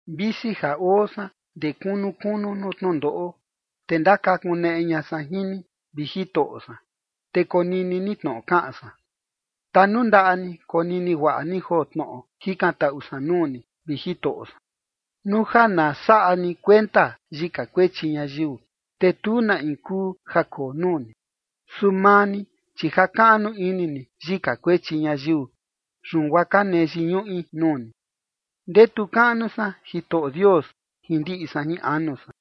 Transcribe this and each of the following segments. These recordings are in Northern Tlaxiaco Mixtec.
Visi ja oo san ndee kunu kunu nuu tnundoꞌo, te ndakakuneꞌe ña san jin ni, vi Jitoꞌo san. Te konini ni tnoꞌo kaꞌan san. Tanundaꞌa ni konini guaꞌa ni joo tnoꞌo jikantaꞌu san nuu ni, vi Jitoꞌo san. Nuu ja na saꞌa ni kuenta yika kuechi ñayiu, te tu na in kuu ja koo nuu ni. Su maa ni, chi jakaꞌnu ini ni yika kuechi ñayiu, yun guaa ka nee yiñuꞌi nuu ni. Ndetu kaꞌnu san Jitoꞌo Dios jin ndiꞌi san jin anu san,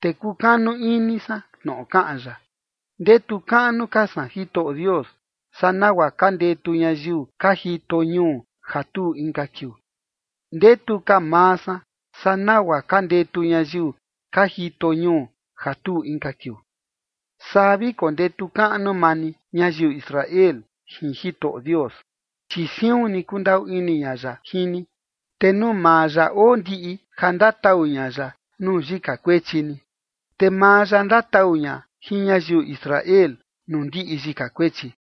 te kukanu ini san tnoꞌo kaꞌan ya. Ndetu kaꞌnu ka san Jitoꞌo Dios saa nagua ka ndetu ñayiu ka jito ñuu ja tuu inka kiuu. Ndetu ka maa san saa nagua ka ndetu ñayiu ka jito ñuu ja tuu inka kiuu. Saa vi kondetu kaꞌnu maa ni, ñayiu Israel, jin Jitoꞌo Dios, chi siun ni kundaꞌu ini ña ya jin ni, te nuu maa ya oo ndiꞌi ja ndatau ña ya nuu yika kuechi ni. Te maa ya ndatau ña jin ñayiu Israel nuu ndiꞌi yika kuechi.